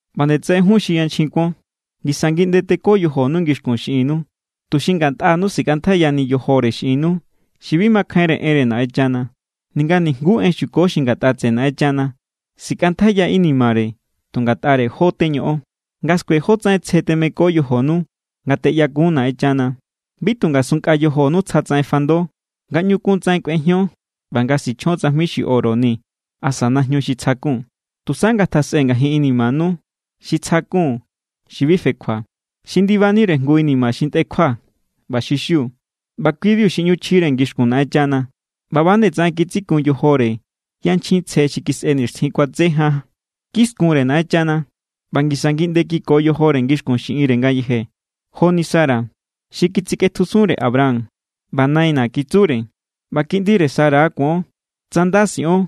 ꞌBa nde tsaꞌen jun xi yanchjin kuon. Ngisa ngiꞌnde teko yojonu ngixkun xiꞌinnu, tuxi ngatꞌanu sikꞌantjaiyani yojore xiꞌinnu xi bi makjainre enre Naꞌenchana, ninga nijnguú en xuko xi ngatꞌa tseꞌe Naꞌenchana. Sikꞌantjaiya inimare tu ngatꞌare jó teñoꞌon, nga skue jótsaꞌen tsje temeko yojonu nga teꞌyakun Naꞌenchana. Bi tu ngasunnkꞌa yojonu tsjatsaꞌen fando nga ꞌñu kuntsaꞌen kꞌuejion ꞌba nga sichjion tsajmi xi oro ni asa najñu xi tsjakun. Tusa ngatjasꞌe ngajin inimanu xi tsjakun xi bi fekjua. Xi ndibanire jngu inima xi ntꞌekjua ꞌba xi xiu. ꞌBa kui=biu xi ꞌñu chjire ngixkun Naꞌenchana. ꞌBa ꞌba=nde tsaꞌen kitsikun yojore yanchjin tsje xi kisꞌe nixtjin kuatse jan. Kiskunre Naꞌenchana ꞌba ngisa ngiꞌnde kiko yojore ngixkun xiꞌinre ngayeje. Joni Sara. Xi kitsikꞌetjusunre Abraham ꞌba “naina̱” kitsure. ꞌBa kiꞌndire Sara= kuon, tsa nda siꞌon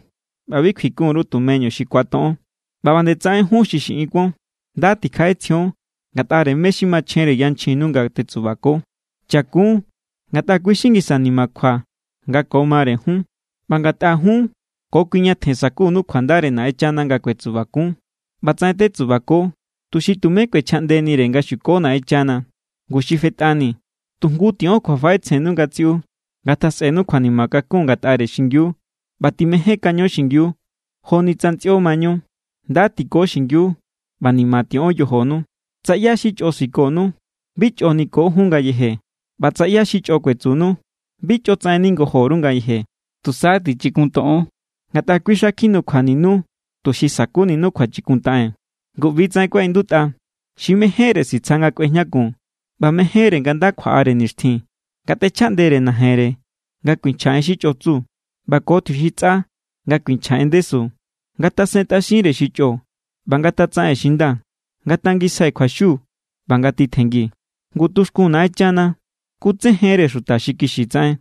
ꞌba bi kjuikun_ru tumeñu xi ku̱atoꞌon. ꞌBa ꞌba nde tsaꞌen jun xi xiꞌin kuon. Nda tikjaꞌetsjion ngatꞌare mé= xi machjenre yanchjinnu nga tetsubako. Chakun, ngatꞌa kui= xi ngisa nimakjua nga ko mare jun ꞌba ngatꞌa jun ko kui ñatjen sa̱kunu kjuandare Naꞌenchana nga kuetsubakun. ꞌBatsaꞌen tetsubako tuxi tumé kꞌuechjaꞌndenire nga xuko Naꞌenchana. Ngu xi fetꞌani, tu jngu tiꞌon kjuafaꞌetsjennu ngatsiꞌu. Ngatjasꞌenu kjuanima kakun ngatꞌare xingiu ꞌba timejénkaño xingiu joni tsa ntsꞌio= mañu. Nda tiko xingiu ꞌba ni̱ma̱ tiꞌon yojonu. Tsa ꞌyá xi chꞌo sikonu, bi chꞌo niko jun ngayeje. ꞌBa tsa ꞌyá xi chꞌo kuetsunu, bi chꞌotsaꞌen ningojo_ru ngayeje. Tusa tichikuntoꞌon. Ngatꞌa kui xa kjinukjuaninu, tuxi sa̱kuninu kjuachikuntaꞌen. Ngu ꞌbi=tsaꞌen kuaꞌindutꞌa: Xi mejénre sitsja nga kꞌuejñakun, ꞌba mejénre nga nda kjuaꞌare nixtjin, ngatꞌechjaꞌndere najenre nga kuinchja en xi chꞌo tsu, ꞌba ko tjiuxintsꞌa nga kuinchja en ndesu. Ngatasentꞌaxinre xi chꞌo, ꞌba ngatatsaꞌen xi nda. Ngatangisjai kjuaxiu ꞌba ngatitjenngi. Ngu tuxkun Naꞌenchana kutsejenre xuta xi kixi tsaꞌen,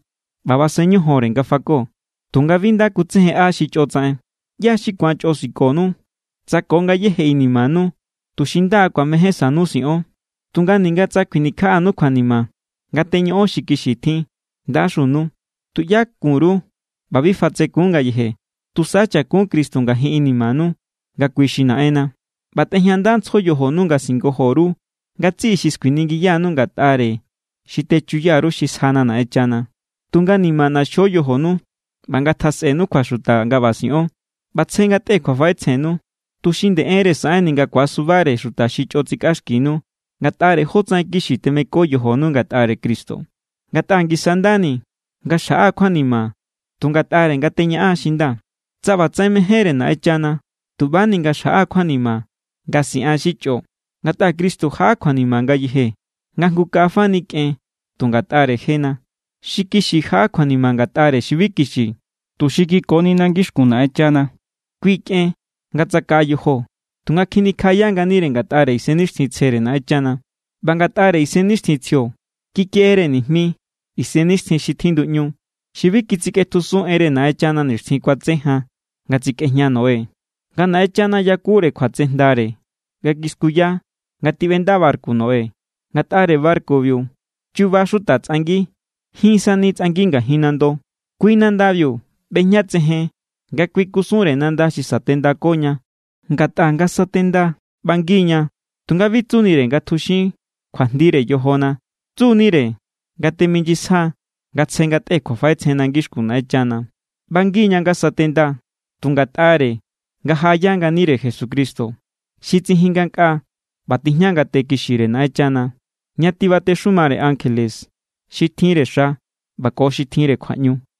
ꞌba basen ñojonre nga fako, tunga bi nda kutsejenꞌa xi chꞌo tsaꞌen. ¿ꞌYá= xi ku̱an chꞌo sikonu, tsa ko ngayéje inimanu tu xinda ku̱amejénsanu siꞌon? Tunga ninga tsa kjuinikjaꞌanu kjuanima nga teñoꞌon xi kixi tjin, ¡ndaxunu! Tuꞌyá kun_ru ꞌba bi fatsekun ngayeje. Tusa chakun Cristo ngajin inimanu nga kui xi Naꞌenna, ꞌba tꞌejñandantsjo yojonu nga singojo_ru ngatsiꞌi xi skuiningiyanu ngatꞌare xi techuya_ru xi sjana Naꞌenchana. Tunga ni̱ma̱ ꞌnaxjo yojonu ꞌba ngatjasꞌenu kjuaxuta nga ꞌba siꞌon. ꞌBa tsje ngatꞌe kjuafaꞌetsjennu, tuxi nde enre saꞌenni nga ku̱asubare xi chꞌo tsikꞌaxkinu ngatꞌare jótsaꞌen kixi temeko yojonu ngatꞌare Cristo. Ngatꞌa ngisa= ndani nga xjaꞌa kjuanima tu ngatꞌare nga teñaꞌan xi nda, tsa ꞌbatsaꞌen mejénre Naꞌenchana, tu ꞌbani nga xjaꞌa kjuanima nga siꞌan xi chꞌo. Ngatꞌa Cristo jaꞌa kjuanima ngayeje nga jngu kaꞌa fani kꞌen tu ngatꞌare jena. Xi kixi jaꞌa kjuanima ngatꞌare xi bi kixi, tuxi kikonina ngixkun Naꞌenchana. Kui kꞌen nga tsakaꞌa yojo, tunga kjinikjaꞌaya nganire ngatꞌare Isennixtjintsjere Naꞌenchana. ꞌBa ngatꞌare Isennixtjintsjio kikeꞌere nijmi isennixtjin xi tjinduꞌñu. Xi bi kitsikꞌetjusun enre Naꞌenchana nixtjin kuatse jan nga tsikꞌejña Noé, nga Naꞌenchana yakure kjuatsejndare nga kiskuya nga tiꞌbenda barku Noé. Ngatꞌare barkubiu chuba xuta tsꞌangi. Jin sani tsꞌangi ngajin nando. Kui nandabiu ꞌbejñatsejen nga kui kusunre nanda xi satendakoña. Ngatꞌa nga satenda, ꞌbangi=ña. Tunga bi tsunire nga tjuxin kjuajndire yojona. Tsu=nire nga teminyisja nga tsje ngatꞌe kjuafaꞌetsjenna ngixkun Naꞌenchana. ꞌBangi=ña nga satenda tu ngatꞌare nga jaꞌaya nganire Jesucristo. Xi tsijin ngankꞌaa ꞌba tijña ngate kixire Naꞌenchana, ña tibatexumare ankjele, xi tjinre xa ꞌba ko xi tjinre kjuaꞌñu.